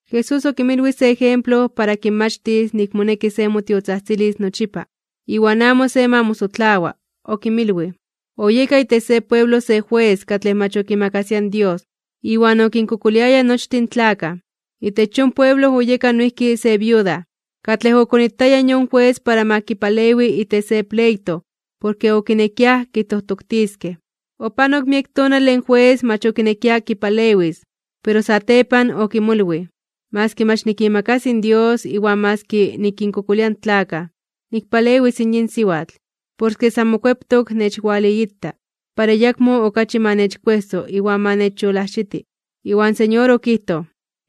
Jesús okinmilwij se ejemplo para kinmachtis nik moneki se motiotzajtzilis nochipa, iwan amo se ma mosotlawa. Okinmilwij: ―Oyeka itech se pueblo se jues katlej mach okimakasia in Dios, iwan okinkokoliaya nochtin tlakaj. Itech yon pueblo oyeka noijki se viuda, katlej okonitaya in yon jues para ma kipalewi itech se pleito porke okinekiaj kitojtoktiskej. Opanok miek tonale in jues mach okinekia kipalewis, pero satepan okimolwij: “Maski mach nikimakasi in Dios iwan maski nikinkokolia in tlakaj, nikpalewis in yin siwatl, porke san mokueptok nechwaliita, para ayakmo okachi ma nechkuejso iwan ma nechyolajxiti.” Iwan Señor okijtoj: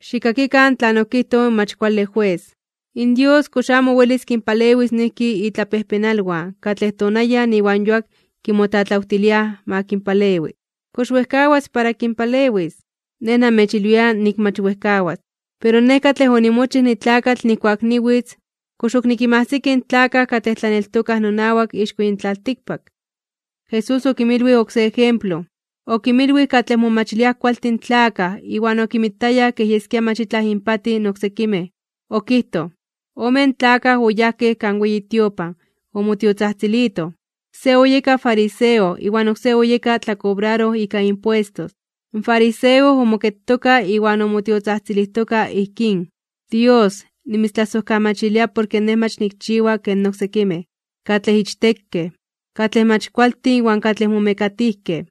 ―Xikkakikan tlan okijtoj in mach kuale jues. ¿In Dios kox amo welis kinpalewis noijki itlapejpenalwan, katlej tonayan iwan yuak kimotlatlawtiliaj ma kinpalewi? ¿Kox wejkawas para kinpalewis? Nej namechilwia nik mach wejkawas. Pero Nej katlej onimochij nitlakatl nijkuak niwitz, ¿kox ok nikinmajsiki in tlakaj katlej tlaneltokaj nonawak ixko yin tlaltikpak? Jesús okinmilwij oksé ejemplo, okinmilwij katlej momachiliaj kualtin tlakaj iwan okinmitayaj kej yeskia mach itlaj inpatij in oksekimej. Okijtoj: ―Omen tlakaj oyajkej kan weyi tiopan omotiotzajtzilitoj: se oyeka fariseo, iwan oksé oyeka tlakobraroj ika impuestos. In fariseo omoketoka iwan omotiotzajtzilijtokaj ijkín: “Dios, nimitztlasojkamachilia porke nej mach nikchiwa ken oksekimej, katlej ichtekej, katlej mach kualtin iwan katlej momekatijkej.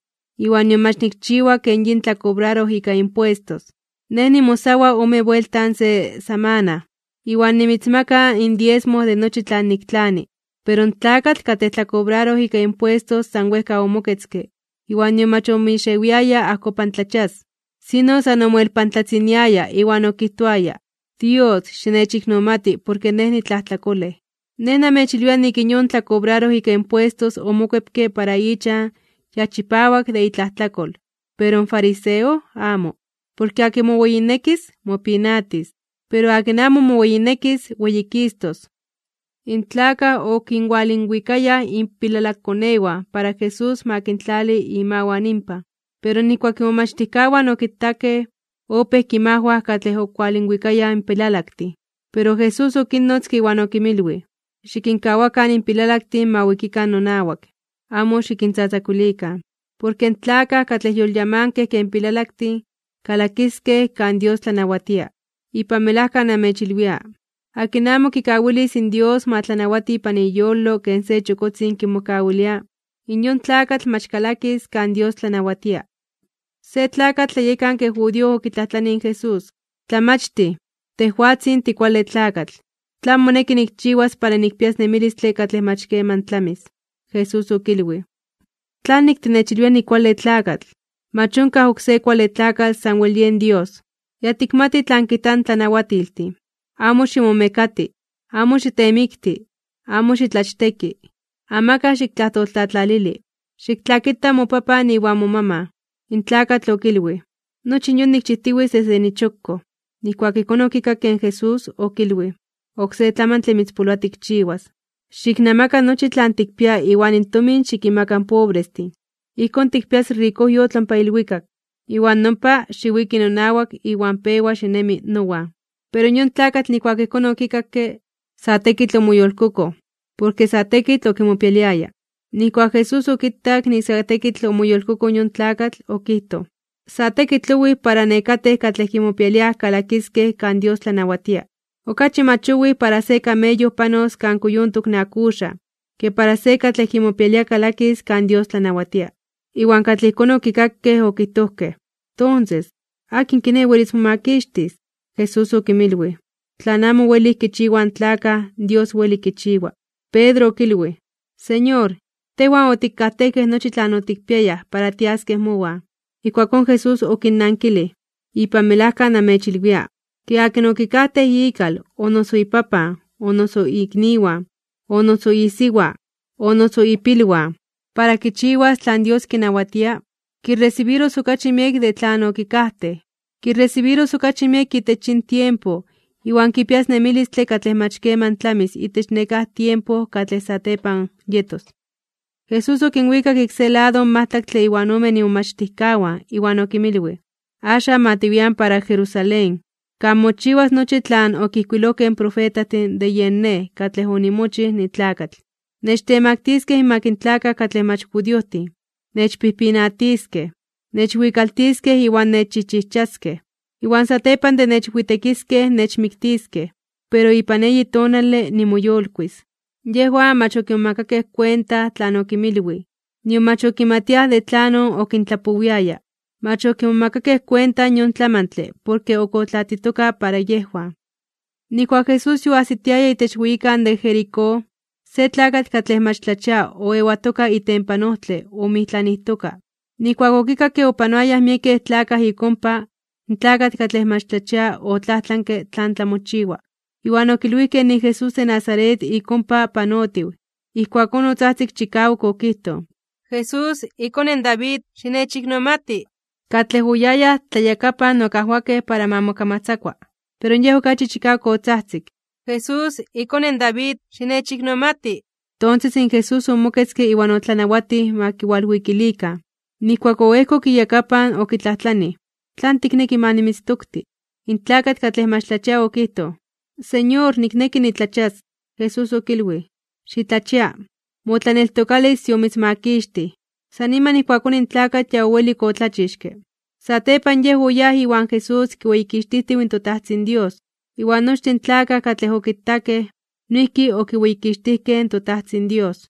Iwan nion mach nikchiwa ken yin tlakobraroj ika impuestos. Nej nimosawa (niayunaroa) ome buelta se samana, iwan nimitzmaka in diesmo de nochi tlan niktlani.” Pero in tlakatl katlej tlakobraroj ika impuestos san wejka omoketzke iwan nion mach omixewiaya ajkopantlachias, sino san omoelpantlatziniaya iwan okijtoaya: “¡Dios, xinechiknomati, porke nej nitlajtlakolej!” Nej namechilwia nik in yon tlakobraroj ika impuestos omokuepke para ichan ya chipawak de itlajtlakol. Pero in fariseo amo. Porke akin moweyinekis, mopinatis. Pero akin amo moweyinekis, weyikistos (weyititos). In tlakaj okinwalinwikayaj inpilalakkonewan para Jesús ma kintlali imawan inpan. Pero nijkuak imomachtijkawan okitakej, opéj kinmajwaj katlej okinwalinwikayaj in pilalaktin. Pero Jesús okinnotzke iwan okinmilwij: ―Xikinkawakan in pilalaktin ma wikikan nonawak, amo xikintzatzakuilikan. Porke in tlakaj katlej yolyamankej ken pilalaktin, kalakiskej kan Dios tlanawatia. Ipan melajka namechilwia, akin amo kikawilis Dios ma tlanawati ipan iyolo ken se chokotzin kimokawilia, in yon tlakatl mach kalakis kan Dios tlanawatia. Se tlakatl tlayekanke judío okitlajtlanij in Jesús: ―Tlamachtij, tejwatzin tikuale tlakatl, ¿tlan moneki nikchiwas para nikpias nemilistle katlej mach keman tlamis? Jesús okilwij: ―¿Tlanik tinechilwia nikuale tlakatl? Mach onkaj oksé kuale tlakatl sanwel yen Dios. Ya tikmati tlan kijtaj in tlanawatiltin: “Amo ximomekati, amo xitemikti, amo xitlachteki, amakaj xiktlajtoltlatlalili, xiktlakita mopapan iwan momaman.” In tlakatl okilwij: ―Nochi in yon nikchijtiwitz desde nichokkoj. Nijkuak ijkón okikakke in Jesús, okilwij: ―Oksé tlamantle mitzpoloa tikchiwas: xiknamaka nochi tlan tikpia iwan in tomin xikinmaka in pobrestin. Ijkón tikpias rikojyotl ompa ilwikak. Iwan nompa, xiwiki nonawak iwan pewa xinemi nowan. Pero yon tlakatl nijkuak ijkón okikakke, sa tekitl omoyolkokoj, porke sa tekitl okimopialiaya. Nijkuak Jesús okitak nik sa tekitl omoyolkokoj yon tlakatl, okijtoj: ―Sa tekitl owij para nekatej katlej kimopialiaj kalakiskej kan Dios tlanawatia. Okachi mach owij para se kameyo panos kan kuyontok in akuxaj, ke para se katlej kimopialia kalakis kan Dios tlanawatia. Iwan katlej ijkón okikakej okijtojkej: ―Tonses, ¿akin kiné welis momakixtis? Jesús okinmilwij: ―Tlan amo welij kichiwaj in tlakaj, Dios weli kichiwa. Pedro okilwij: ―Señor, tejwan otikajtejkej nochi tlan otikpiayaj para tiaskej mowan. Ijkuakón Jesús okinnankilij: ―Ipan melajka namechilwia, ke akin okikajtej ikal, o noso ipapan, o noso ikniwan, o noso isiwa, o noso ipilwan, para kichiwas tlan Dios kinawatia, kiresibiros okachi miek de tlan okikajtej. Kiresibiros okachi miek itech yin tiempo, iwan kipias nemilistle katlej mach keman tlamis itech nekáj tiempo katlej satepan yetos. Jesús okinwikak ik se lado in majtlaktle iwan omen imomachtijkawan, iwan okinmilwij: ―Axan ma tiwian para Jerusalén, kan mochiwas nochi tlan okijkuilojkej in profetajtin de yen Nej katlej onimochij nitlakatl. Nechtemaktiskej (nechtemaktiliskej) inmak in tlakaj katlej mach judiojtin, nechpijpinatiskej, nechwikaltiskej iwan nechchijchijchaskej. Iwan satepan de nechwitekiskej, nechmiktiskej. Pero ipan eyi tonale nimoyolkuis (nimoyolitis). Yejwan mach okimomakakej kuenta tlan okinmilwij, nion mach okimatiaj de tlanon okintlapowiaya. Mach okimomakakej kuenta yon tlamantle porke ok otlatitoka para yejwan. Nijkuak Jesús yoajsitiaya itech weyikan de Jericó, se tlakatl katlej mach tlachia oewatoka itempan ojtle omoijtlanijtoka. Nijkuak okikakke opanoayaj miekej tlakaj ik ompa, in tlakatl katlej mach tlachia otlajtlanke tlan tlamochiwa. Iwan okilwijkej nik in Jesús de Nazaret ik ompa panotiw. Ijkuakón otzajtzik chikawak okijtoj: ―¡Jesús, iKone in David, xinechiknomati! Katlej oyayaj tlayakapan okajwakej para ma mokamatzakua, pero yej okachi chikawak otzajtzik: ―¡Jesús, iKone in David, xinechiknomati! Tonses in Jesús omoketzke iwan otlanawatij ma kiwalwikilikan. Nijkuak oejkok iyakapan, okitlajtlanij: ―¿Tlan tikneki ma nimitztokti? In tlakatl katlej mach tlachia okijtoj: ―Señor, nikneki nitlachias. Jesús okilwij: ―¡Xitlachia! Motlaneltokalis yomitzmakixtij. San niman ijkuakón in tlakatl ya owelik otlachixke. Satepan yej oyáj iwan Jesús kiweyikixtijtiw in toTajtzin Dios. Iwan nochtin in tlakaj katlej okitakej, noijki okiweyikixtijkej in toTajtzin Dios.